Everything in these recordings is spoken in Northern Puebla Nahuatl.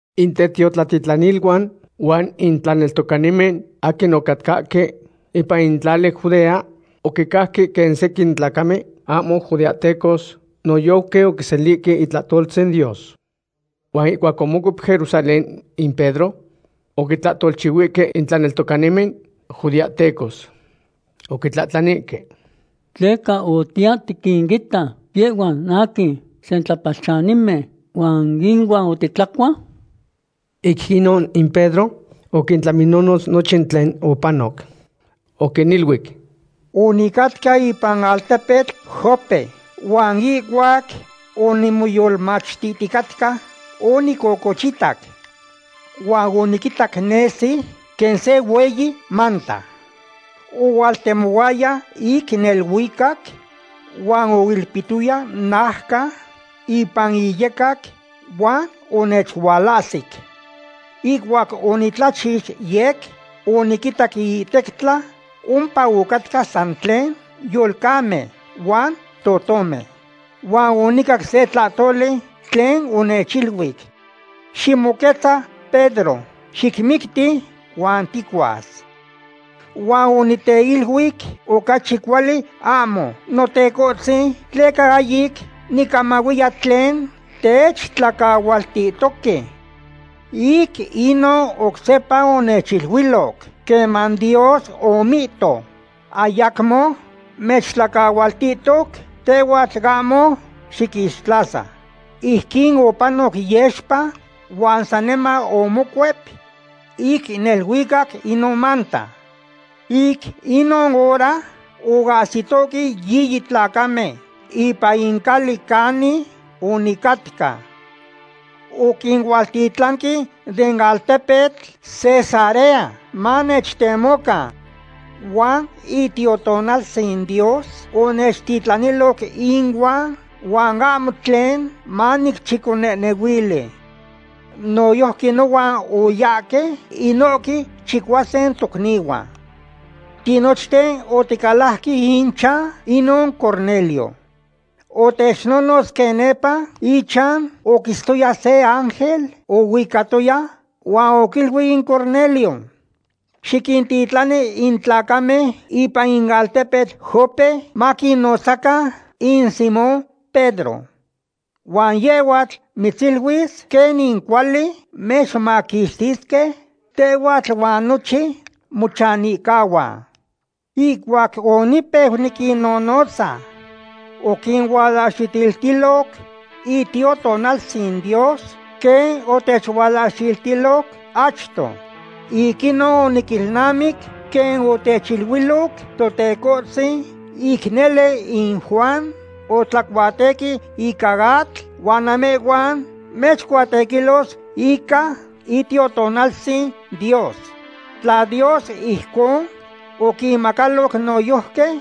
In tetiotlatitlaniluan huan in tlaneltocanimen aquin ocatcahque ipan in tlali Judea oquicajque quen sequin tlacamen ahmo judeahtecos noyojqui oquiselihque itlahtoltzin Dios. Huan ihcuac omocuep Jerusalén in Pedro, oquitlahtolchihuihque in tlaneltocanimen judeahtecos. Oquitlahtlanihque: ―¿Tleca otiya tiquinita yehhuan aquin sentlapalchanimen, huan inuan otitlacua? Ic inon in Pedro oquintlaminonotz nochin tlen opanoc. Oquiniluic: ―Onicatca ipan altepetl Jope, huan ihcuac onimoyolmachtihticatca, onicocochitac. Huan oniquitac nesi quen se hueyi manta. Ohualtemohuaya ic neluicac huan oilpihtoya naucan ipan iyecac huan onechualahsic. Ihcuac onitlachix yec oniquinitac iihtectla ompa ocatcahque san tlen yolcamen huan totomen. Huan onicac se tlahtoli tlen onechiluic: “Ximoquetza Pedro. Xicmicti huan ticuas.” Huan onicteluic: “Ocachi cuali ahmo, Notecohtzin, tleca ahyic nicamahuiya tlen techtlacahualtihtoque.” Ic inon oc sepa onechiluiloc: “Queman Dios omihto: Ayacmo mechtlacahualtihtoc; tehhuatl ahmo xiquixtlasa.” Ijquin opanoc yexpa, huan saniman omocuep ic neluicac inon manta. Ic inon hora oahsitohque yiyi tlacamen ipan in cali canin onicatca. Oquinualtitlanque den altepetl Cesarea, manechtemocan. Huan Itiotonaltzin Dios onechtitlaniloc inuan huan ahmo tlen manicchiconehnehuili. Noyojqui nohuan oyahque inohque chicuasin tocnihuan. Tinochten oticalajque ichan inon Cornelio. Otechnonotz quen nepa ichan oquitztoya se ángel oicatoya huan oquiluic in Cornelio: “Xiquintitlani in tlacamen ipan in altepetl Jope maquinotzacan in Simón Pedro. Huan yehhuatl mitziluis quenin cuali mechmaquixtisque tehhuatl huan nochin mochanihcahuan.” Ihcuac onipeu niquinnonotza, oquinualahxiltiloc Itiotonaltzin Dios quen otechualahxiltiloc achto. Ic inon oniquilnamic quen otechiluiloc Totecohtzin: “Ic nele in Juan otlacuatequi ica atl, huan namehhuan mechcuatequilos ica Itiotonaltzin Dios.” Tla Dios ijcon oquinmacaloc noyojqui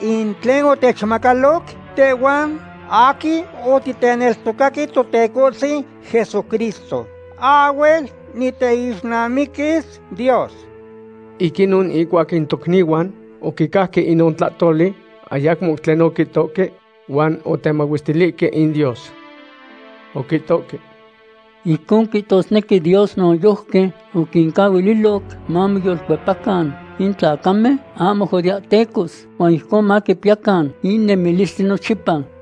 in tlen otechmacaloc tehhuan aquin otiteneltocaque Totecohtzin Jesucristo, ahhuel niteixnamiquis Dios. Ic inon ihcuac in tocnihuan oquicajque inon tlahtoli, ayacmo tlen oquihtohque huan otemahuestilihque in Dios. Oquihtohque: ―Ijcon quihtosnequi Dios noyojqui oquincahuililoc mamoyolcuepacan in tlacamen ahmo judeahtecos huan ijcon maquipiyacan in nemilistli nochipa.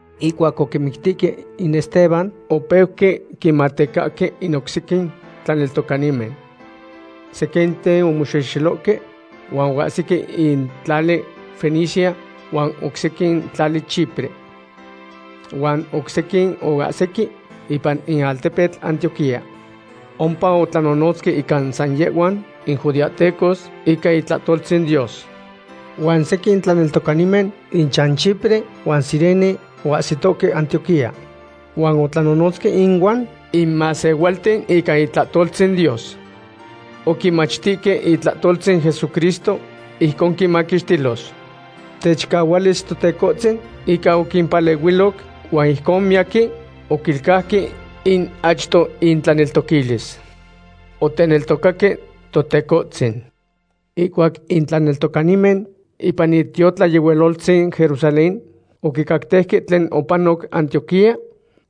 Ihcuac oquimictihque in Esteban, opeuque quinmatecahque in oc sequin tlaneltocanimen. Sequinten omoxexelohque huan oahsique in tlali Fenicia, huan oc sequin in tlali Chipre. Huan oc sequin oahsique ipan in altepetl Antioquía. Ompa otlanonotzque ica san yehhuan in judeahtecos ica itlahtoltzin Dios. Huan sequin tlaneltocanimen inchan Chipre huan Cirene oahsitohque Antioquía. Huan otlanonotzque ihuan in masehualten ica itlahtoltzin Dios. Oquinmachtihque itlahtoltzin Jesucristo ijcon quinmaquixtilos. Techicahualis Totecohtzin ica oquimpalehuiloc, huan ijcon miyaquin oquilcauque in achto intlaneltoquilis. Oteneltocaque Totecohtzin. Ihcuac in tlaneltocanimen ipan itiotlayehualoltzin Jerusalén oquicactejque tlen opanoc Antioquía,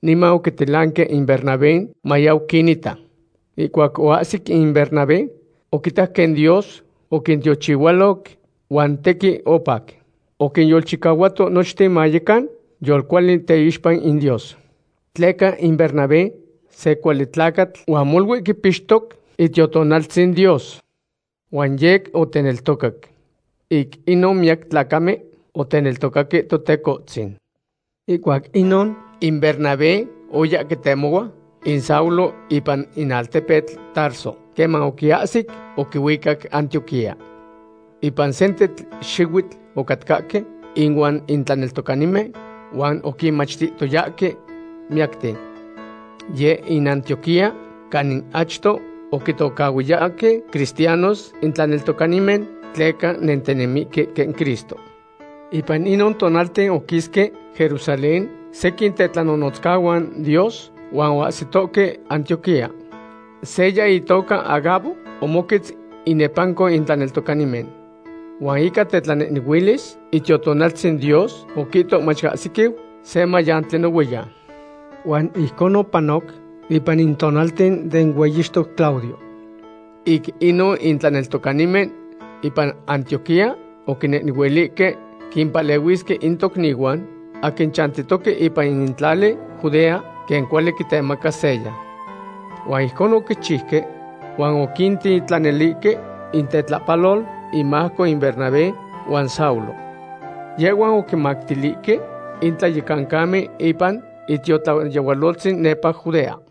niman oquititlanque in Bernabé mayau quinita. Ihcuac oahsic in Bernabé, oquitac quen Dios oquintiochihualoc, huan tequin opac. Oquinyolchicahuato nochten mayecan yolcuali teixpa in Dios. Tleca in Bernabé se cuali tlacatl huan molui quipixtoc Itiotonaltzin Dios. Huan yec oteneltocac. Ic inon miyac tlacamen oteneltocaque Totecohtzin. Ihcuac inon, in Bernabé oya quitemohua in Saulo ipan in altepetl Tarso. Queman oquiahsic, oquihuicac Antioquía. Ipan sentetl xihuitl ocatcahque inuan in tlaneltocanimen, huan oquinmachtihtoyahque miyacten. Yeh in Antioquía canin achto oquitocahhuiyahque cristianos in tlaneltocanimen tleca nentinemihque quen Cristo. Ipan inon tonalten oquisque Jerusalén sequin tetlanonotzcahuan Dios huan oahsitohque Antioquía. Seya itoca Agabo omoquetz inepanco in tlaneltocanimen. Huan ica tetlanehnehuilis Itiotonaltzin Dios oquihto mach ahsiquiu se mayantli nohuiyan. Huan ijcon opanoc ipan in tonalten den hueyixtoc Claudio. Ic inon in tlaneltocanimen ipan Antioquía oquinehnehuilihque quimpalehuisque in tocnihuan aquin chantitoque ipan in tlali Judea, quen cuali quitemaca seya. Huan ijcon oquichiuque, huan oquintitlanilihque intetlapalol inmajco in Bernabé huan Saulo. Yehhuan oquimactilihque in tlayecancamen ipan itiotlayehualoltzin nepa Judea.